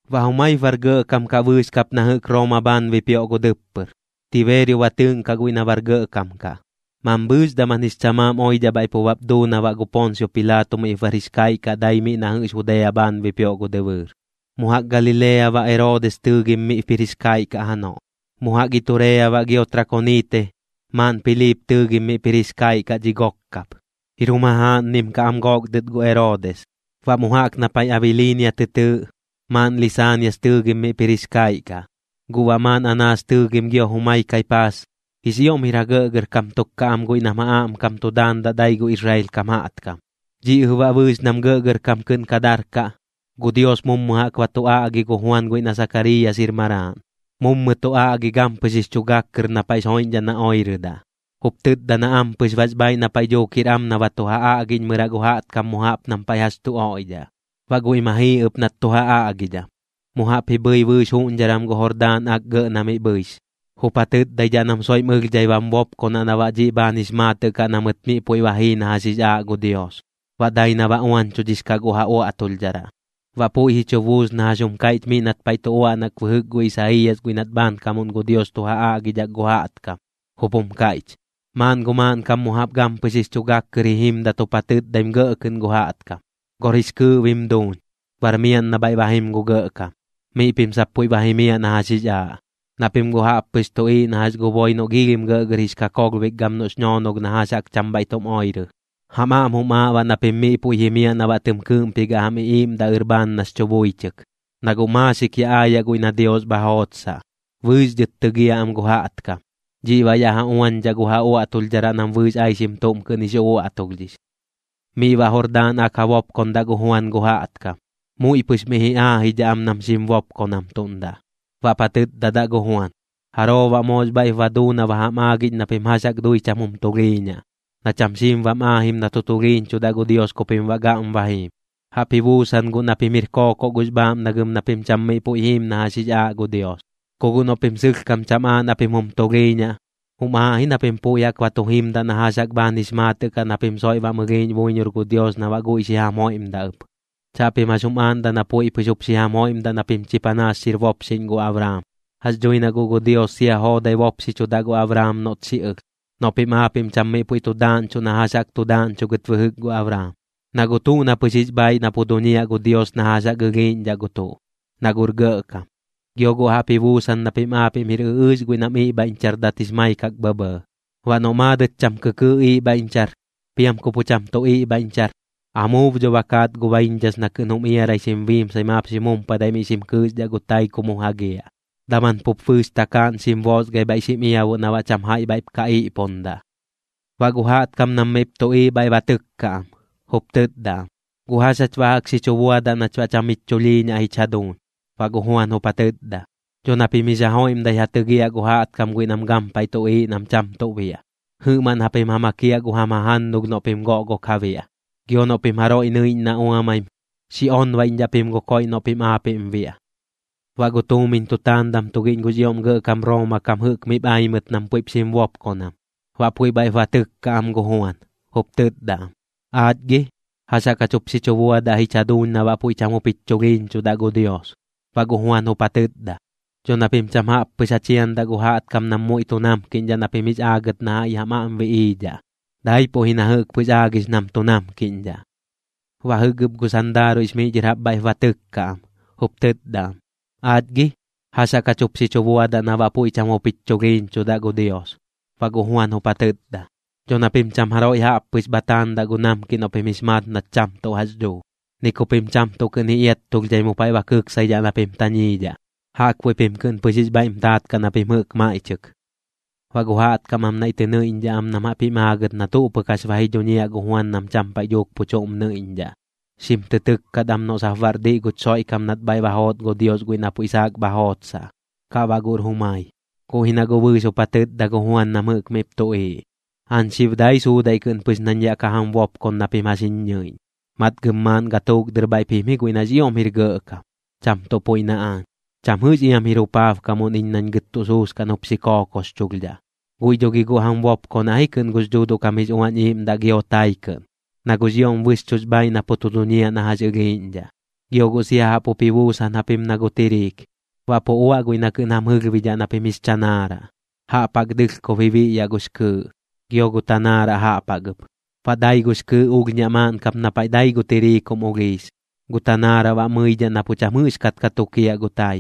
Baꞌ jumaip bar gɇꞌkam kaꞌ bɨɨx kap na jɨꞌk Rooma bhaan bipioꞌ gu dɨppɨr, Tibeerio ba tɨɨꞌnkaꞌ guiꞌ na bar gɇꞌkam kaꞌ. Mambhɨɨx daman jix chamaam oidhaꞌ bhaiꞌ pu bap duu na baꞌ gu Poonsio Pilaato miꞌp bar jix kaiꞌ kaꞌ dai miꞌ na jɨꞌx Judea bhaan bipioꞌ gu dɨbɨɨr. Mu jaꞌk Galilea baꞌ Eroodis tɨɨgim miꞌp jir jix kaiꞌ kaꞌ janoꞌ. Mu jaꞌk Iturea baꞌ gio Trakoniite, maaꞌn Piliip tɨɨgim miꞌp jir jix kaiꞌ kaꞌ dhi gok kap, jir jum jajaaꞌnnim kaꞌ am gook dɨt gu Eroodis. Baꞌ mu jaꞌk na paiꞌ Abiliinia tɨ tɨɨꞌ, maaꞌn Lisaanias tɨɨgim miꞌp jir jix kaiꞌ kaꞌ. Guꞌ baꞌ maaꞌn Anaas tɨɨgim gio jumai Kaipaas, jix ioꞌm jir ja gɇꞌgɇrkam tuk kaꞌ am guiꞌ nam ja aꞌmkam tu daandaꞌ dai gu Israel kam jaꞌtkam. Dhiꞌ jɨꞌ baꞌ bɨɨx nam gɇꞌgɇrkam kɨꞌn ka darkaꞌ, gu Dios mummɨ jaꞌk ba tu aꞌgi gu Juan guiꞌ na Sakariiyas jir maraaꞌn. Mummɨ tu aꞌgi gampɨx jix chu gak kɨr na paiꞌx joiꞌñdhaꞌ na oirɨdaꞌ, jup tɨtda na ampɨx bax bhaaiꞌ na paiꞌ dhuuk jir am na ba tu ja aꞌgiꞌñmɨraꞌ gu jaꞌtkam mu jaꞌp nam paiꞌ jax tu oiꞌdhaꞌ. Baꞌ guiꞌ ma jii ɨp nat tu ja aꞌgidham, mu jaꞌp ji bhɨi bɨɨx juꞌñdharam gu Jordaan Ak gɇꞌ na miꞌ bhɨix, jup ja tɨtdaidhaꞌ nam soiꞌm ɨlhdhai bam bopkonaꞌ na baꞌ dhiꞌ bhaan jix maatɨꞌ kaꞌ na mɨt miꞌ puiꞌ ba jii na jax jix aaꞌ gu Dios, baꞌ dai na ba uañchudhix kaꞌ gu ja uaꞌtulhdharaꞌ. Baꞌ puiꞌ ji chu buus na jax jum kaiꞌch miꞌ nat paiꞌ tu uaꞌnak bɨjɨk gu Isaiiyas guiꞌ nat bhaankamuꞌn gu Dios tu ja aꞌgidhak gu jaꞌtkam. Jup jum kaiꞌch: Maaꞌn gu maaꞌnkam mu jaꞌp gampɨx jix chu gak kɨr ji jimdat jup ja tɨtdaim gɇꞌ kɨꞌn gu jaꞌtkam: “Gor jix kɨɨꞌ bim duuñ, bar miaꞌn na bhaiꞌ ba jim gu Gɇꞌkam. Miꞌ pim sap puiꞌ ba jimiaꞌ na jax jix aaꞌ. Na pim guꞌ jaꞌp pɨx tuꞌiiꞌ na jax gu boi noꞌ giilhim gɇꞌgɇr jix kakolhbik gam noꞌx ñoonolh na jax jaꞌk cham bhaiꞌ tum oirɨ. Jam aꞌm jum aaꞌ baꞌ na pim miꞌ puiꞌ jimiaꞌ na baꞌ tɨm kɨɨꞌmpigaꞌ jam iꞌiiꞌmdaꞌ ɨr bhaan nax chu buichɨk. Na guꞌ maaxik ya aayaꞌ guiꞌ na Dios bha jootsaꞌ, bɨɨx dhɨt tɨgiaꞌ am gu jaꞌtkam. Dhiꞌ baꞌ yaꞌ ja uañdhaꞌ gu ja uaꞌtulhdharaꞌ nam bɨɨx aixim tuꞌm kɨꞌn jix uꞌuaꞌtulhdhix.” Miꞌ baꞌ Jordaan Ak ja bopkondaꞌ gu Juan gu jaꞌtkam. Muiꞌ pɨx miꞌ ji aajidhaꞌ am nam xim bopkonamtuꞌndaꞌ. Baꞌp ja tɨtdadaꞌ gu Juan: ―¿Jaroo baꞌ moox bhaiꞌp ba duu na ba jam aagiꞌñ na pim jax jaꞌk dui cham jum tulhiiñaꞌ, na cham xiim bam aajim na tu tulhiiñchudaꞌ gu Dios ku pim baꞌ gaꞌm ba jiim? Jaꞌp ji buusan guꞌ na pim jir kookoꞌ gux bhaaꞌmnagɨm na pim cham miꞌ puiꞌ jiim na jax jix aaꞌ gu Dios. Ku guꞌ noꞌ pim sɨlhkam cham aaꞌ na pim jum tulhiiñaꞌ, jum aaꞌ ji na pim puiꞌ jaꞌk ba tu jimdaꞌ na jax jaꞌk bhaan jix maatɨꞌ kaꞌ na pim soiꞌ bam ɨlhiiꞌñ buiñor gu Dios na baꞌ guiꞌ xi jam joiꞌmdaꞌ ɨp. Chaꞌpim jax jum aaꞌndaꞌ na puiꞌ pɨx jup xi jam joiꞌmdaꞌ na pim chi panaas xir bopxiꞌñ gu Abraam. Jax dhui na guꞌ gu Dios sia joodai bopxichudaꞌ gu Abraam noꞌt xi ɨlh, noꞌ pim aapiꞌm cham miꞌ puiꞌ tu daaꞌñchuꞌ na jax jaꞌk tu daaꞌñchugɨt bɨjɨk gu Abraam. Na guꞌ tuꞌ na pɨx jix bhaaiꞌ na pu duñiaꞌ gu Dios na jax jaꞌk ɨlhiiꞌñdhaꞌ gu tuꞌ, na guꞌr gɇꞌkam. Gio guꞌ jaꞌp ji buusan na pim aapiꞌm jir ɨꞌɨɨx guiꞌ nam iꞌbhaiꞌñchardat jix maikak bhɇbhɇɇ. Baꞌ noꞌ maadɨt cham kɨkɨɨꞌ iꞌbhaiꞌñchar, piam ku pu cham tu iꞌbhaiꞌñchar, amuub dho ba kaat gu baiñdhas na kɨꞌn jum iarai xim biimsai maap xim jumpadai miꞌ xim kɨɨxdhaꞌ gu tai ku mu jagiaꞌ, daman pup bɨɨx takaaꞌn xim boosgai bhaiꞌ xim iabuꞌ na baꞌ cham jaiꞌ bhaiꞌp ka iꞌpundaꞌ. Baꞌ gu jaꞌtkam nam miꞌp tuꞌiiꞌ bhaiꞌ ba tɨkka am, jup tɨtda am: ―¿Guꞌ jax jach baꞌ jaꞌk xi chu buadaꞌ nach baꞌ cham jich chulhiiñaꞌ jich jaduuñ? Baꞌ gu Juan jup ja tɨtda: ―Dho na pim jix ja joiꞌmdai ja tɨgiaꞌ gu jaꞌtkam guiꞌ nam gampaiꞌ tuꞌiiꞌ nam cham tuꞌ biaꞌ. Jɨꞌmaꞌn japim ja makiaꞌ gu jam jajannulh noꞌ pim goꞌgok ja biaꞌ. Gio noꞌ pim jaroiꞌ nɨiꞌñ na uamaim, xi onbaiꞌñdhaꞌ pim gu koiꞌ noꞌ pim aapiꞌm biaꞌ. Baꞌ gu tuumiñ tutaandam tugiꞌñ gux ioꞌm gɇꞌkam Rooma kam jɨꞌk miꞌp ai mɨt nam puiꞌp xim bopkonam. Baꞌ puiꞌ bhaiꞌp ba tɨkka am gu Juan, jup tɨtda am: ―¿Aach gi, jax jaꞌk jup xi chu buadaꞌ jich jaduuñ na baꞌ puiꞌ cham jup jich chulhiiñchudaꞌ gu Dios? Baꞌ gu Juan jup ja tɨtda: ―Dho na pim cham jaꞌp pɨx ja chiandaꞌ gu jaꞌtkam nam muiꞌ tu namkiꞌñdhaꞌ na pim jix aagɨt na jaiꞌ jam aꞌm biꞌiidhaꞌ, daipuꞌ ji na jɨꞌk pɨx aagix nam tu namkiꞌñdhaꞌ. Baꞌ jɨꞌk ɨp gu sandaaruiꞌx miꞌ dhɨr jaꞌp bhaiꞌp ba tɨkka am, jup tɨtda am: ―¿Aach gi, jax jaꞌk jach jup xi chu buadaꞌ na baꞌ puiꞌ cham jup jich chulhiiñchudaꞌ gu Dios? Baꞌ gu Juan jup ja tɨtda: ―Dho na pim cham jaroiꞌ jaꞌp pɨx bha taandaꞌ gu namkiꞌ noꞌ pim jix maat nat cham tuꞌ jax dhuu, ni ku pim cham tuꞌ kɨꞌn ji iattulhdhai mu paiꞌ ba kɨksaidhaꞌ na pim tañiidhaꞌ. Jaꞌkbuiꞌ pim pɨx kɨꞌn jix bhaiꞌm taat kaꞌ na pim jɨꞌk maiꞌchɨk. Baꞌ gu jaꞌtkam am naiꞌ tɨ nɨiꞌñdhaꞌ am nam jaꞌp jim aagɨt na tuꞌ pɨk jax ba ji dhuñiaꞌ gu Juan nam cham paiꞌ dhuuk pu chuꞌm nɨiꞌñdhaꞌ, xim tɨ tɨkkat am noꞌ sap baꞌr diꞌ guch Xoiꞌkam nat bhaiꞌ ba joot gu Dios guiꞌ na puiꞌ saak bha jootsaꞌ, kaꞌ baꞌ guꞌr jumai. Guꞌ ji na guꞌ bɨɨx jup ja tɨtda gu Juan nam jɨꞌk miꞌp tuꞌiiꞌ: ―Aañ xib dai suudaiꞌ kɨꞌn pɨx nañ yaꞌ ka jam bopkon na pim jax jiñ ñɨiꞌñ, matgɨm maaꞌn gatuuk dɨr bhaiꞌp jim ji guiꞌ nax ioꞌm jir gɇꞌkam, cham tuꞌ puiꞌ na aañ. Cham jɨꞌx iam jir jupaabkamuꞌn iñ nañ gɨt tuꞌ suuskaꞌn jup xi kookoxchulhdhaꞌ. Guiꞌ dho gi guꞌ jam bopkonaꞌ ji kɨꞌn gux Dhuuduꞌ kam jix Uañ Iiꞌmdaꞌ gio tai kɨꞌn, na guꞌx ioꞌm bɨxchuꞌx bhaiꞌ na pu tu duñiaꞌ na jax ɨlhiiꞌñdhaꞌ. Gio guꞌ sia jaꞌp jup ji buusan japim na gu tiriik. Baꞌ pu uaꞌ guiꞌ na kɨꞌn jam jɨlhbidhaꞌ na pim jix chanaaraꞌ, jaꞌp jaꞌk dɨlhkob ji biꞌyaꞌ gux kɨɨꞌ, gio gu tanaaraꞌ jaꞌp jaꞌk ɨp. Baꞌ dai gux kɨɨꞌ ulhñaꞌ maaꞌn kap na paiꞌ dai gu tiriik jum ulhiis, gu tanaaraꞌ baꞌ mɨidhaꞌ na pu cham jɨꞌxkat ka tukiaꞌ gu tai.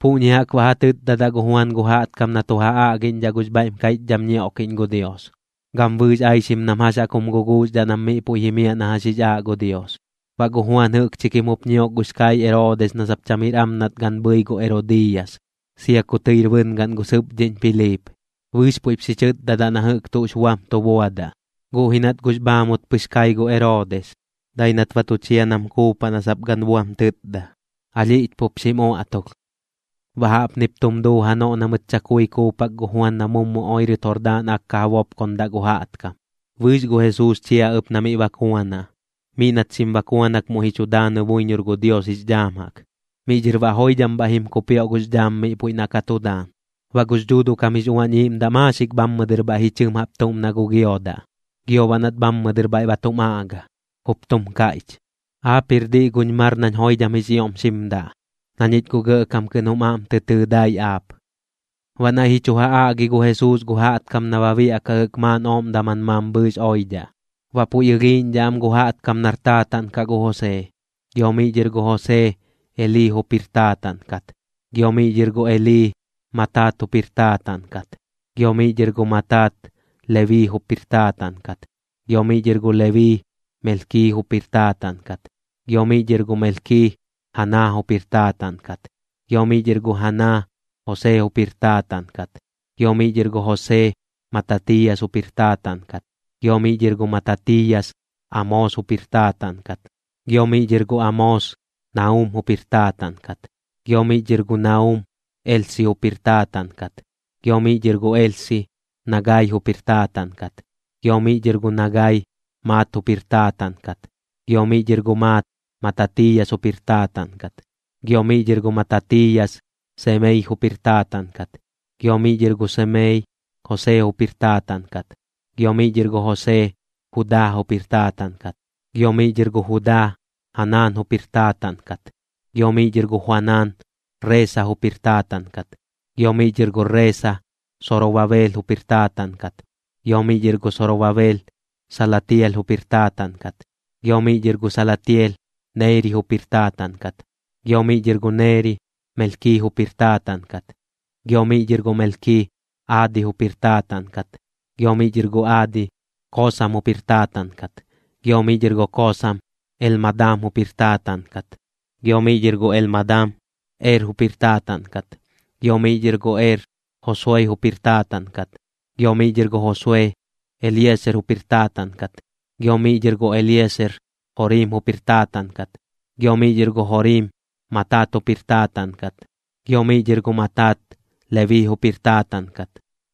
Puꞌñi jaꞌk baꞌ ja tɨtdadaꞌ gu Juan gu jaꞌtkam na tu ja aꞌgiꞌñdhaꞌ gux bhaiꞌm kaiꞌchdham ñioꞌkiꞌñ gu Dios, gam bɨɨx aixim nam jax jaꞌk jum guguuxdhaꞌ nam miꞌ puiꞌ jimiaꞌ na jax jix aaꞌ gu Dios. Baꞌ gu Juan jɨꞌkchi kim jup ñiok gux kaiꞌ Eroodis na sap cham jir am nat gan bhɨi gu Erodiiyas, sia ku tɨir bɨngaꞌn gu sɨpdhiꞌñ Piliip. Bɨɨx puiꞌp xi chɨtdadaꞌ na jɨꞌk tuꞌx buam tu buadaꞌ. Guꞌ ji nat guꞌx bhaamut pɨx kai gu Eroodis, dai nat ba tu chia nam kuupaꞌ na sap gan buam tɨtda, alhiꞌch pup xim uaꞌtulh. Baꞌ jaꞌpnip tum duu janoꞌ na mɨt chakui kuupak gu Juan na mummɨ oirɨt Jordaan Ak ka ja bopkondaꞌ gu jaꞌtkam. Bɨɨx gu Jesuus chia ɨp na miꞌ bakuanaꞌ. Miꞌ nat xim bakuanak muiꞌ ji chu daanɨ buiñor gu Dios jix dhaam jaꞌk. Miꞌ dhɨr baꞌ joidham bhaiꞌ jim kupioꞌ gux dhaam miꞌ puiꞌ na ka tu daan. Baꞌ gux Dhuuduꞌ kam jix Uañ Iiꞌmdaꞌ maaxik bhammɨ dɨr bhaiꞌ ji chɨm jaꞌp tuꞌm na gu giodaꞌ. Gio baꞌ nat bhammɨ dɨr bhaiꞌ ba tum aꞌga, jup tum kaiꞌch: ―Aap jir diꞌ guñ mar nañ joidham jix ioꞌm xim daꞌ, na ñich guꞌ gɇꞌkam kɨꞌn jum aꞌm tɨ tɨɨ dai aap. Baꞌ naiꞌ ji chu ja aꞌgi gu Jesuus gu jaꞌtkam na ba biaꞌkaꞌ jɨꞌk maaꞌn ooꞌm daman mambhɨɨx oidhaꞌ. Baꞌ puiꞌ ɨlhiiꞌñdhaꞌ am gu jaꞌtkam nar taataꞌn kaꞌ gu Josee, gio miꞌ dhɨr gu Josee, Elii jup jir taataꞌn kat. Gio miꞌ dhɨr gu Elii, Matat jup jir taataꞌn kat. Gio miꞌ dhɨr gu Matat, Lebii jup jir taataꞌn kat. Gio miꞌ dhɨr gu Lebii, Melki jup jir taataꞌn kat. Gio miꞌ dhɨr gu Melki, Jana jup jir taataꞌn kat. Gio miꞌ dhɨr gu Jana, Josee jup jir taataꞌn kat. Gio miꞌ dhɨr gu Josee, Matatiiyas jup jir taataꞌn kat. Gio miꞌ dhɨr gu Matatiiyas, Amoos jup jir taataꞌn kat. Gio miꞌ dhɨr gu Amoos, Naum jup jir taataꞌn kat. Gio miꞌ dhɨr gu Naum, Elsi jup jir taataꞌn kat. Gio miꞌ dhɨr gu Elsi, Nagai jup jir taataꞌn kat. Gio miꞌ dhɨr gu Nagai, Maat jup jir taataꞌn kat. Gio miꞌ dhɨr gu Maat, Matatiiyas jup jir taataꞌn kat. Gio miꞌ dhɨr gu Matatiiyas, Semei jup jir taataꞌn kat. Gio miꞌ dhɨr gu Semei, Josee jup jir taataꞌn kat. Gio miꞌ dhɨr gu Josee, Judaa jup jir taataꞌn kat. Gio miꞌ dhɨr gu Judaa, Joanan jup jir taataꞌn kat. Gio miꞌ dhɨr gu Joanan, Reesa jup jir taataꞌn kat. Gio miꞌ dhɨr gu Reesa, Sorobabeel jup jir taataꞌn kat. Gio miꞌ dhɨr gu Sorobabeel, Salatiel jup jir taataꞌn kat. Gio miꞌ dhɨr gu Salatiel, Neeri jup jir taataꞌn kat. Gio miꞌ dhɨr gu Neeri, Melki jup jir taataꞌn kat. Gio miꞌ dhɨr gu Melki, Aadi jup jir taataꞌn kat. Gio miꞌ dhɨr gu Aadi, Kosam jup jir taataꞌn kat. Gio miꞌ dhɨr gu Kosam, Elmadam jup jir taataꞌn kat. Gio miꞌ dhɨr gu Elmadam, Er jup jir taataꞌn kat. Gio miꞌ dhɨr gu Er, Josue jup jir taataꞌn kat. Gio miꞌ dhɨr gu Josue, Elieser jup jir taataꞌn kat. Gio miꞌ dhɨr gu Elieser, Jorim jup jir taataꞌn kat. Gio miꞌ dhɨr gu Jorim, Matat jup jir taataꞌn kat. Gio miꞌ dhɨr gu Matat, Lebii jup jir taataꞌn kat.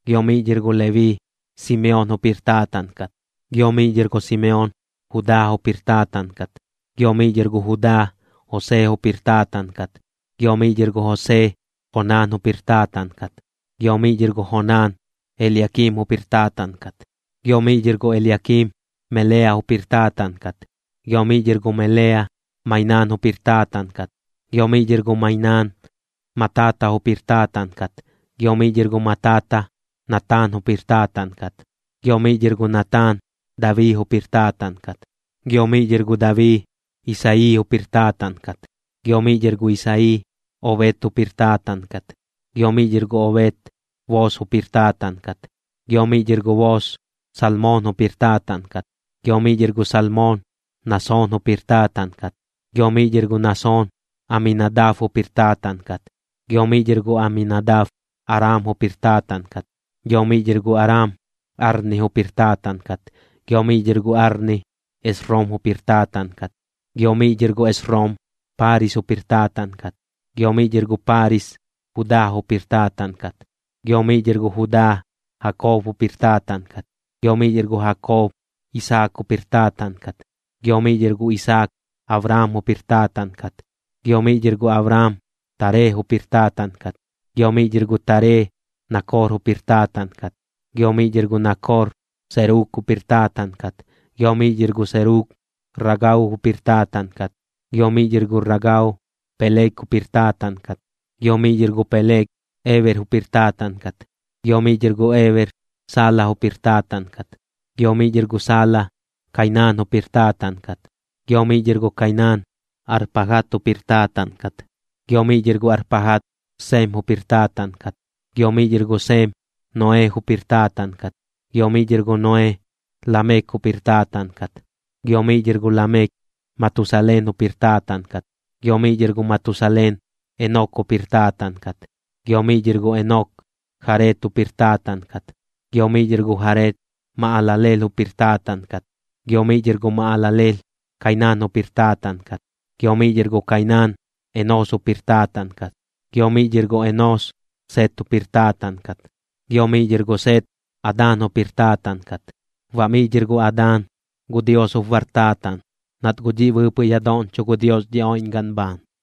Gio miꞌ dhɨr gu Lebii, Simeon jup jir taataꞌn kat. Gio miꞌ dhɨr gu Simeon, Judaa jup jir taataꞌn kat. Gio miꞌ dhɨr gu Judaa, Josee jup jir taataꞌn kat. Gio miꞌ dhɨr gu Josee, Jonaan jup jir taataꞌn kat. Gio miꞌ dhɨr gu Jonaan, Eliakiim jup jir taataꞌn kat. Gio miꞌ dhɨr gu Eliakiim, Melea jup jir taataꞌn kat. Gio miꞌ dhɨr gu Melea, Mainaan jup jir taataꞌn kat. Gio miꞌ dhɨr gu Mainaan, Matata jup jir taataꞌn kat. Gio miꞌ dhɨr gu Matata, Nataan jup jir taataꞌn kat. Gio miꞌ dhɨr gu Nataan, Dabii jup jir taataꞌn kat. Gio miꞌ dhɨr gu Dabii, Isayii jup jir taataꞌn kat. Gio miꞌ dhɨr gu Isayii, Obed jup jir taataꞌn kat. Gio miꞌ dhɨr gu Obed, Boos jup jir taataꞌn kat. Gio miꞌ dhɨr gu Boos, Salmoon jup jir taataꞌn kat. Gio miꞌ dhɨr gu Salmoon, Nasoon jup jir taataꞌn kat. Gio miꞌ dhɨr gu Nasoon, Aminadab jup jir taataꞌn kat. Gio miꞌ dhɨr gu Aminadab, Aram jup jir taataꞌn kat. Gio miꞌ dhɨr gu Aram, Arni jup jir taataꞌn kat. Gio miꞌ dhɨr gu Arni, Esrom jup jir taataꞌn kat. Gio miꞌ dhɨr gu Esrom, Paaris jup jir taataꞌn kat. Gio miꞌ dhɨr gu Paaris, Judaa jup jir taataꞌn kat. Gio miꞌ dhɨr gu Judaa, Jakob jup jir taataꞌn kat. Gio miꞌ dhɨr gu Jakob, Isaak jup jir taataꞌn kat. Gio miꞌ dhɨr gu Isaak, Abraam jup jir taataꞌn kat. Gio miꞌ dhɨr gu Abraam, Taree jup jir taataꞌn kat. Gio miꞌ dhɨr gu Taree, Nakor jup jir taataꞌn kat. Gio miꞌ dhɨr gu Nakor, Serug jup jir taataꞌn kat. Gio miꞌ dhɨr gu Serug, Ragau jup jir taataꞌn kat. Gio miꞌ dhɨr gu Ragau, Peleg jup jir taataꞌn kat. Gio miꞌ dhɨr gu Peleg, Eber jup jir taataꞌn kat. Gio miꞌ dhɨr gu Eber, Sala jup jir taataꞌn kat. Gio miꞌ dhɨr gu Sala, Kainaan jup jir taataꞌn kat. Gio miꞌ dhɨr gu Kainaan, Arpajad jup jir taataꞌn kat. Gio miꞌ dhɨr gu Arpajad, Sem jup jir taataꞌn kat. Gio miꞌ dhɨr gu Sem, Noee jup jir taataꞌn kat. Gio miꞌ dhɨr gu Noee, Lamek jup jir taataꞌn kat. Gio miꞌ dhɨr gu Lamek, Matusaleen jup jir taataꞌn kat. Gio miꞌ dhɨr gu Matusaleen, Enok jup jir taataꞌn kat. Gio miꞌ dhɨr gu Enok, Jared jup jir taataꞌn kat. Gio miꞌ dhɨr gu Jared, Mahalaleel jup jir taataꞌn kat. Gio miꞌ dhɨr gu Mahalaleel, Kainaan jup jir taataꞌn kat. Gio miꞌ dhɨr gu Kainaan, Enoos jup jir taataꞌn kat. Gio miꞌ dhɨr gu Enoos, Set jup jir taataꞌn kat. Gio miꞌ dhɨr gu Set, Adaan jup jir taataꞌn kat. Baꞌ miꞌ dhɨr gu Adaan, gu Dios jup bar taataꞌn, nat guꞌ dhiꞌ bɨɨpɨꞌ ya doꞌñcho gu Dios dhi oiꞌñgaꞌn bhaan.